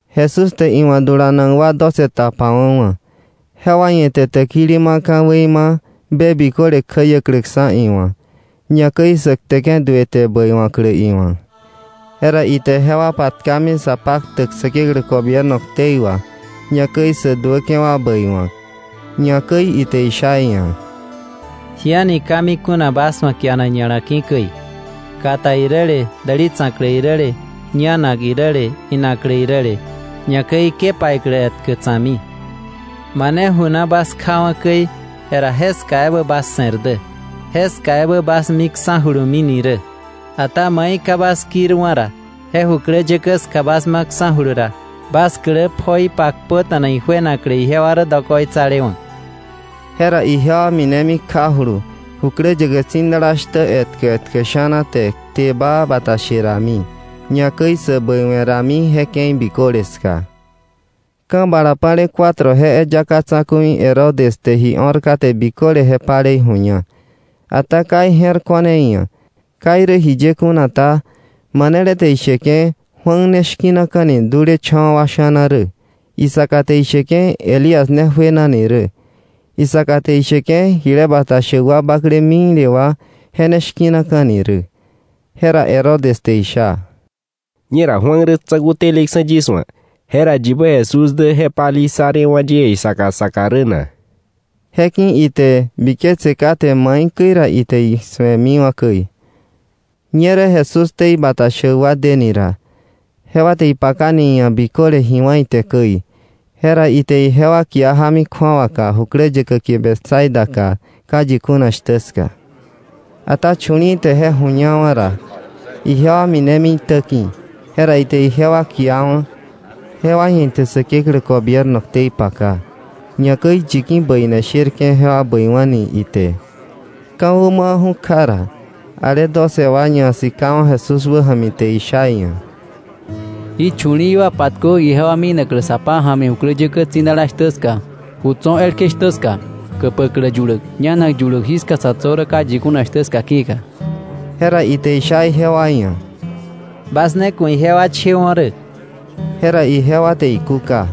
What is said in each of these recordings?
Jesús te iwa̱ dulanak wa doce tapawa̱wa̱. Jewa ia̱ ite täkili ma ka̱wei ma be biköle kjäiäkläksa̱ iwa̱, ñakäi sä kteke̱ duë te bäiwa̱klä iwa̱. Jera ite jewa patkami sa paktäk Säkeklä gobierno ktei wà, ñakäi sä duäke̱ wa bäiwa̱k. Ñakäi ite isha iia̱: —Ji a̱ni ka mi kuna bas wa̱ kianak ña̱la ki̱ käi, kata iräle, däli tsa̱klä iräle, ñanak iräle, inaklä iräle, ñakäi ke paiklä etkä tsa̱kmi. Mane ju na bas kjawa̱ käi, jera jeska ebä bas se̱r dä, jeska ebä bas miksa̱julumini rä. Ata mai ka bas kirwa̱ ra, je jukläyäkä ska bas maksa̱julu ra, bas klä pjoi pakpöta̱na ijuenaklä ijewa rä dokoitsalewa̱. Jera ijewa minemi kjajulu jukläyäkä tsi̱dala shtä etkä etkä sha̱na te kte baa bata she rami, ñakäi sä bäiwe̱ rami je ke̱i biköle ska. Ka̱ bala pa̱le cuatro je eyaka tsa̱ku̱i Herodes te ji o̱r kate biköle je palei ju̱ña. Ata ka ije̱r ko̱r iia̱. Ka irä jiye kuna ta, manele te isheke̱ Juan ne shki̱naka̱ni dulecha̱wa̱ wa sha̱na rä. Isaka te isheke̱ Elías ne juenani rä. Isaka te isheke̱ jile bata shäk wa bakle mikle wa je ne shki̱naka̱ni rä. Jera Herodes te isha: —Ñera Juan rä tsa̱ku̱ teleksa̱ yis wa̱, jera ¿yibä Jesús dä je palei ssa rewa̱ yie saka saka rä na? Je ki̱ka ite biketse kate maikäi ra ite isu̱emiwa̱ käi. Ñerä Jesús ktei bata shäk wa deni ra, jewa te ipakani iia̱ biköle ji wá̱ ite käi. Jera ite ijewa kia jámi kju̱awaka jukläyäkä kie Betsaidaka ka yi kuna shtä ska. Ata chu̱li̱i̱ te je ju̱ñawa̱ ra, ijewa minemi iitäki̱, jera ite ijewa kiawa̱; jewa ia̱ ite Säkeklä gobierno ktei paka, ñakäi yi ki̱ bäine sherke̱ jewa bäiwa̱ni ite. Ka̱wä mawa̱ju̱ kja ra, ale doce wa ñasikawa̱ Jesús wäja̱mi te isha iia̱: —Jí chu̱li̱i̱ wa patkö ijewa minaklä sa pája̱mi jukläyäkä tsi̱dala shtä ska, ju tso̱ elkje shtä ska, käpäklä yuläk, ñanak yuläk, jiska sa̱ tso̱ rä ka yi kuna shtä ska ki̱ka. Jera ite isha ijewa ia̱: —Bas ne ku̱ ijewa chewo̱ rä. Jera ijewa te ikúka: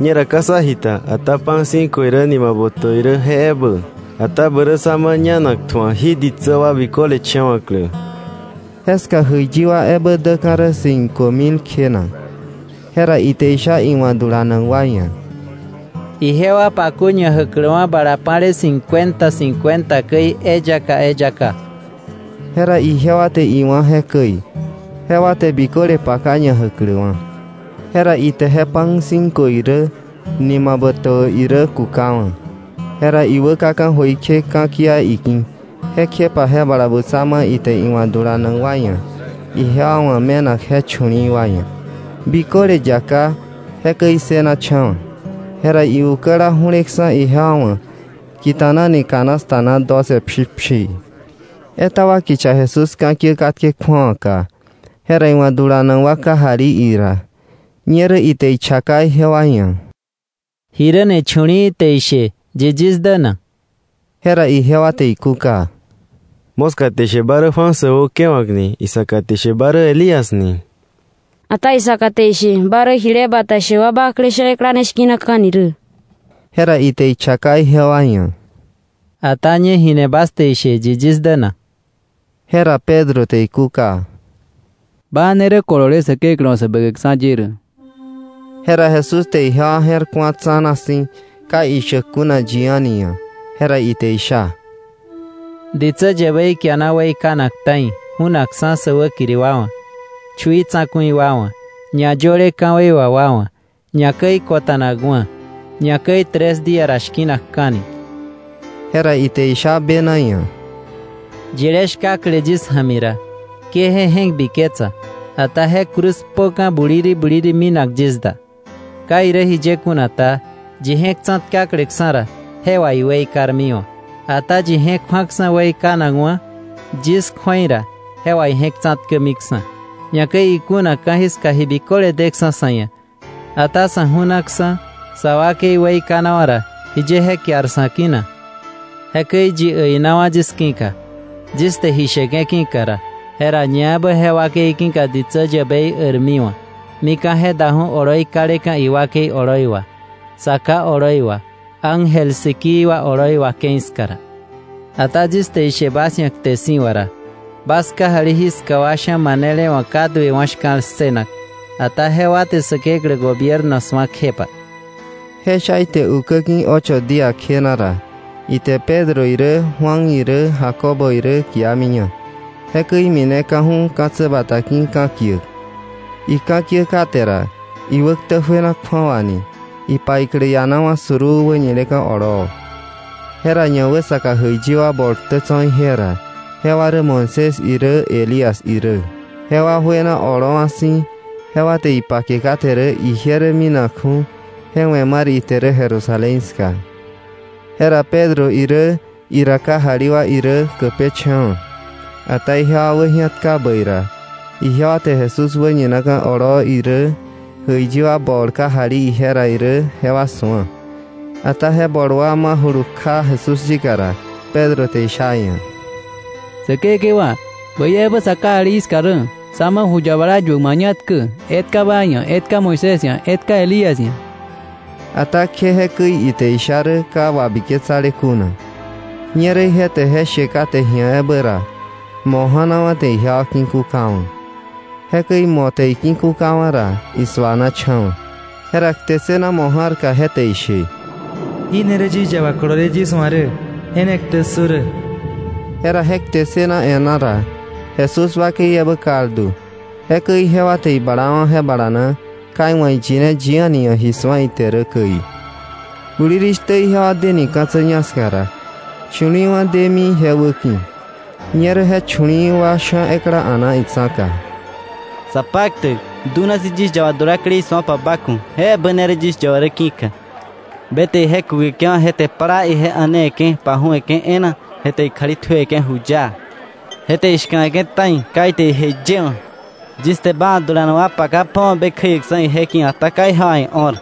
—Ñera ka sá ji ta, ata pan cinco irä nima botäbä irä je ebä. Ata bä rä sá ma ñanak tju̱ak jí ditsä wa biköle chewa̱klä. Jeska jäiyi wa ebä däka̱ rä cinco mil kjena. Jera ite isha iwa̱ dulanak wa ia̱: —Ijewa pakö ñajäkläkwa̱ bala pa̱le cincuenta cincuenta käi, eyaka eyaka. Jera ijewa te iwá̱ jekäi, jewa te biköle paka ñajäkläkwa̱. Jera ite je pan cinco irä, nima botäbä irä kukawa̱, jera iwä kaka̱ jöikje ka̱kia iki̱, kjepa je bala butsa ma ite iwa̱ dulanak wa ia̱ ijewa wa̱ me̱nak je chu̱li̱i̱ wa ia̱. Biköle yaká, jekäi issënacha̱wa̱. Jera iukäla ju̱leksa̱ ijewa wa̱ kita̱nani canasta na doce pshipshii. Etaba kicha Jesús ka̱kiä katke kju̱awaka, jera iwa̱ dulanak wa kajali ira. Ñerä ite ichaka ijewa ia̱: —Jiräni chu̱li̱i̱ te ishe yi yis dä na? Jera ijewa te ikúka: —Moska te ishe ba rä Juan säwäukewa̱k ni; isaka te ishe ba rä Elías ni; ata isaka te ishe ba rä jile bata shäk wa bakle sha̱ ekla ne shki̱naka̱ni rä. Jera ite ichaka ijewa ia̱: —Ata ¿ñe jini bas te ishe, yi yis dä na? Jera Pedro te ikúka: —Ba ne rä kolole Säkeklä wa̱ Säbäkäkksa̱ ye rä. Jera Jesús te ijewa je̱r ku̱a tsa̱na si̱, ka ishäk kuna yi a̱ni ia̱. Jera ite isha: —Ditsä yäbei kiana weikanak ta̱i, ju̱nakksa̱ sä wäkiri wa wa̱, chui tsa̱ku̱i wa wa̱, ñayöle ka̱wei wà wa wa̱, ñakäi kota̱nakwa̱, ñakäi tres día ra shki̱nakka̱ni. Jera ite isha bena ia̱: —Yilé shkakle yis ja̱mi ra, ke je je̱k biketsa, ata je cruz kpöka̱ buliri buliri, minak yis da. Ka irä jiye kuna ta, yi je̱k tsa̱tkakleksa̱ ra, je wà iweikarmiwa̱. Ata yi je̱k ju̱aksa̱ weikanakwa̱ yis kju̱ei ra, je wà ije̱k tsa̱tkämiksa̱. Ñakäi ikuna ka̱jiska ji biköle deksa̱ sa̱ ia̱, ata sa̱ ju̱naksa̱, sa wakei weikanawa̱ ra, jiye je kiar sa̱ ki̱ na? Jekäi yi äinawa̱ yis ki̱ka, yis te ji sheke̱ ki̱ka ra, jera ñaebä je wakei ki̱ka ditsä yäbei äirmiwa̱ mika̱ je daju̱ oloi kaleka̱ iwakei oloi wà, Sa Ká oloi wà, ángel sikii wa oloi wà ke̱i ska ra. Ata yis te ishe bas ia̱ kte si̱wa̱ ra, bas kajali jiska wa sha̱ manele wa̱ ka duewa̱ shka̱l ssënak, ata jewa te Säkeklä gobierno su̱a kjepa. Je sha ite ukä ki̱ ocho día kjena ra, ite Pedro irä Juan irä Jacobo irä kiamiña, jekäi imineka̱ju̱ ka̱tsä bata ki̱ ka̱kiäk. Ika̱kiä kate ra, iwäktä juena kju̱awani, ipaiklä ianawa̱ suruu wäñileka̱ oloo. Jera ñawäsaka jäiyi wa bol ktä tso̱ ije ra, jewa rä Moisés irä Elías irä. Jewa juena oloowa̱ si̱, jewa te ipake kate rä ije rä minakju̱, je we̱ mar ite rä Jerusalén ska. Jera Pedro irä ira kajali wa irä käpeche̱wa̱. Ata ijewa wäji̱atka bäi ra, ijewa te Jesús wäñinaka̱ oloo irä, jäiyi wa bol kajali ije ra irä jewa su̱a. Ata je bol wa majulu kja Jesús yika ra, Pedro te isha iia̱: —Säkekewa, ¡bäi ebä sa kajali jiska rä! Sá ma ju yabala yuäk mañatkä: etka ba ia̱, etka Moisés ia̱, etka Elías ia̱. Ata kje jekäi ite isha rä ka wabiketsale kuna. Ñerä ije te je she kate ji̱a ebä ra, mo̱ ja̱nawa̱ te ijewa ki̱kukawa̱. Jekäi mo̱ te iki̱kukawa̱ ra, isuanacha̱wa̱. Jera kte ssëna mo̱ ja̱rka, je te ishe: “Jí ne rä yis yaba kolole yis wa̱ rä. Je ne ktä ssö rä.” Jera je kte ssëna e̱ná ra, Jesús wakei ebä kaldu. Jekäi ijewa te iblawa̱ je balana, ka iwa̱ iyine yi a̱ni ia̱ ji su̱a ite rä käi. Bulirishtä, ijewa deni ka̱tsä ñak ska ra, chu̱li̱i̱wa̱ demi ije wäki̱. Ñerä je chu̱li̱i̱ wa sha̱ ekla a̱na itsa̱ka: —Sapaktäk, dunasi̱ yis yaba dulaklei su̱opa ba ku̱, je ebä ne rä yis yaba rä ki̱ka. Be te ije kukeke̱wa̱, je te plaa ia̱newe̱ke̱ ipaju̱we̱ke̱ e̱e̱na, je te ikjali tjuewe̱ke̱ juyaa. Je te ishka̱we̱ke̱ ta̱i. Ka ite ije yëwa̱. Yis te ba wa̱ dulanak wa paka pjowa̱ be kjäiäksa̱ ije ki̱, ata ka ijewa ia̱ io̱r.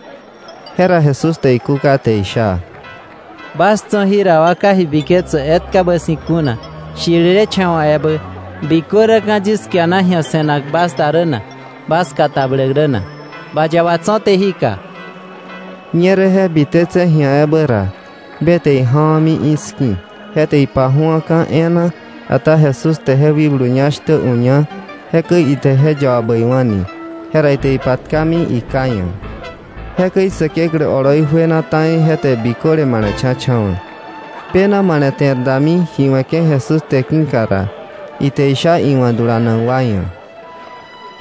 Jera Jesús te ikúka te isha: —¡Bas tso̱ jira wa ka ji biketsäk etkabä si̱ kuna, shirilecha̱wa̱ ebä! ¿Bikö räka̱ yis kiana ji̱a se̱nak bas da rä na, bas katabläk rä na? Ba yaba tso̱té jika. Ñerä je bite tse̱ ji̱a ebä ra, be te ija̱wa̱mi iski̱ je te ipaju̱aka̱ e̱e̱na; ata Jesús te je wikblu ñá shtä uña, jekäi ite je yaba bäiwa̱ni. Jera ite ipatkami iká ia̱. Jekäi Säkeklä oloi juena ta̱i je te biköle male̱cha̱cha̱wa̱. Bena male̱te̱r dami ji we̱ke̱ Jesús te ki̱ka ra, ite isha iwa̱ dulanak wa ia̱: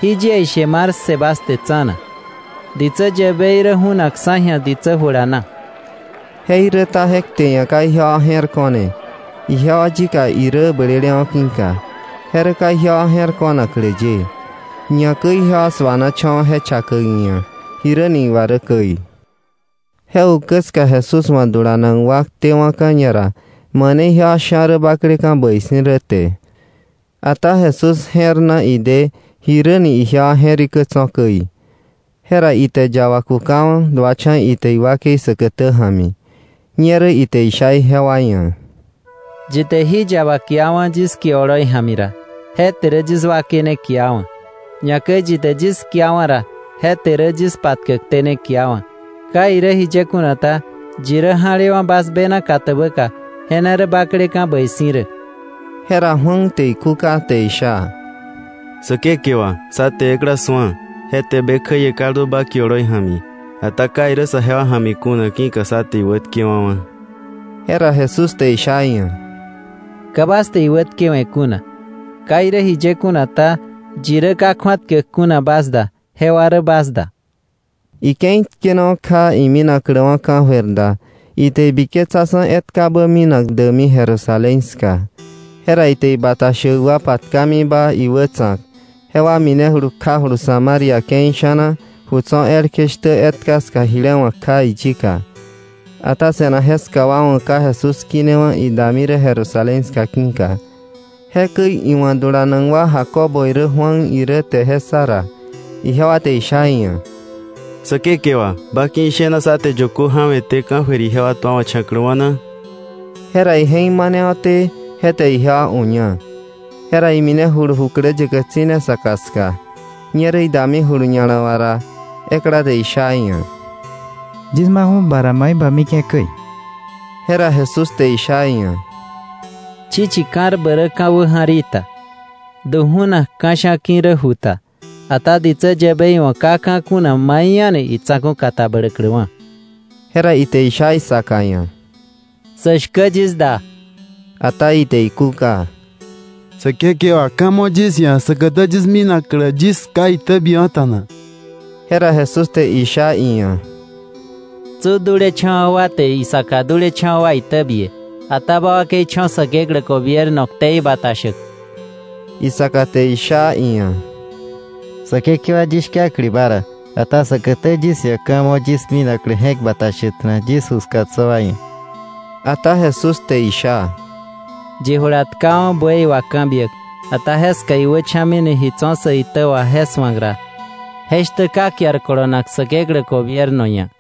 —Jí yie ishe mar ssë bas te tsa̱na: ditsä yäbei rä ju̱nakksa̱ ji̱a ditsä jula na. Jeiräta je kte ia̱ ka ijewa je̱r ko̱ne, ijewa yika irä blelewa̱ ki̱ka, je rä ka ijewa je̱r ko̱naklä ye; ñakäi ijewa suanacha̱wa̱ je chakäk iia̱ jiräni iwa rä käi. Je ukä ska Jesús wa̱ dulanak wa ktewa̱ka̱ ñara mane ijewa sha̱ rä bakleka̱ bäi si̱ rä te. Ata Jesús je̱r na ide jiräni ijewa je̱rikä tso̱ käi, jera ite yaba kukawa̱, duacha̱ ite iwakei säkätä ja̱mi, ñerä ite isha ijewa ia̱: —Yi te jí yaba kiawa̱, yis kie oloi ja̱mi ra, je te rä yis wakei ne kiawa̱. Ñakäi yi te yis kiawa̱ ra, je te rä yis patkäkté ne kiawa̱. Ka irä jiye kuna ta, yi rä ja̱lewa̱ bas bena katäbäka, je ne rä bakleka̱ bäi si̱ rä. Jera Juan te ikúka te isha: —Säkekewa, sá te ekla su̱a, je te be kjäie kaldu ba kie oloi ja̱mi. Ata ka irä sajewa ja̱mi kuna, ki̱ka sá te iwätkewa̱wa̱. Jera Jesús te isha iia̱: —Ka bas te iwätkewe̱ kuna. Ka irä jiye kuna ta, yi rä ka kju̱atkäk kuna bas da, jewa rä bas da. Ike̱i tkenawa̱ kja ikinakläwa̱ ka̱jöir da, ite ibiketsaksa̱ etkabä minak däkmi Jerusalén ska. Jera ite ibata shäk wa patkamiba iwätsa̱k, jewa minejulu kjawa̱julu Samaria ke̱i sha̱na ju tso̱ elkje shtä etka ska jile wa̱k kja iyika. Ata se̱nak jeska wa wa̱ ka Jesús kinewa̱ idami rä Jerusalén ska ki̱ka. Jekäi iwa̱ dulanak wa Jacobo irä Juan irä te je ssa ra, ijewa te isha iia̱: —Säkekewa, ¿ba ki̱ ishena sá te yökö ja̱we̱té ka̱jöir ijewa tuawa̱cha̱kläwa̱ na? Jera ije̱k manewa̱té, je te ijewa uña, jera iminejulu jukläyäkä tsi̱ne saka ska. Ñerä idamijulu ña̱la wà ra, ekla te isha iia̱: —Yis maju̱ ba ra mai ma mike̱ käi. Jera Jesús te isha iia̱: —Chichi ka̱rbä rä ka̱ wäja̱r í ta, du ju̱nak ka̱sha̱ ki̱ rä ju ta, ata ditsä yäbei wa̱ ka ka̱ kuna mai a̱ni itsa̱ku̱ katabläkläwa̱. Jera ite isha isaka ia̱: —Sä shkä yis da. Ata ite ikúka: —Säkekewa, ka̱ mo̱ yis ia̱ säkätä yis minaklä yis ká itäbiäkwa̱ta̱na. Jera Jesús te sha iia̱: —Tsu dulecha̱wa̱ wa te isaka dulecha̱wa̱ wa itäbie. Ata ba wakei cho̱ Säkeklä gobierno ktei bata shäk. Isaka te sha iia̱: —Säkekewa, yis shkakle ba ra, ata säkätä yis ia̱ ka̱ mo yis minaklä je̱k bata shäkta̱na yis ju ska tso̱ wa ia̱. Ata Jesús te isha: —Yi jula tkawa̱ buey wà ka̱ biäk, ata jeska iwächa̱mini ji tso̱ sä itä wà je su̱ak ra, je shtä ka kiar kolonak Säkeklä gobierno ia̱.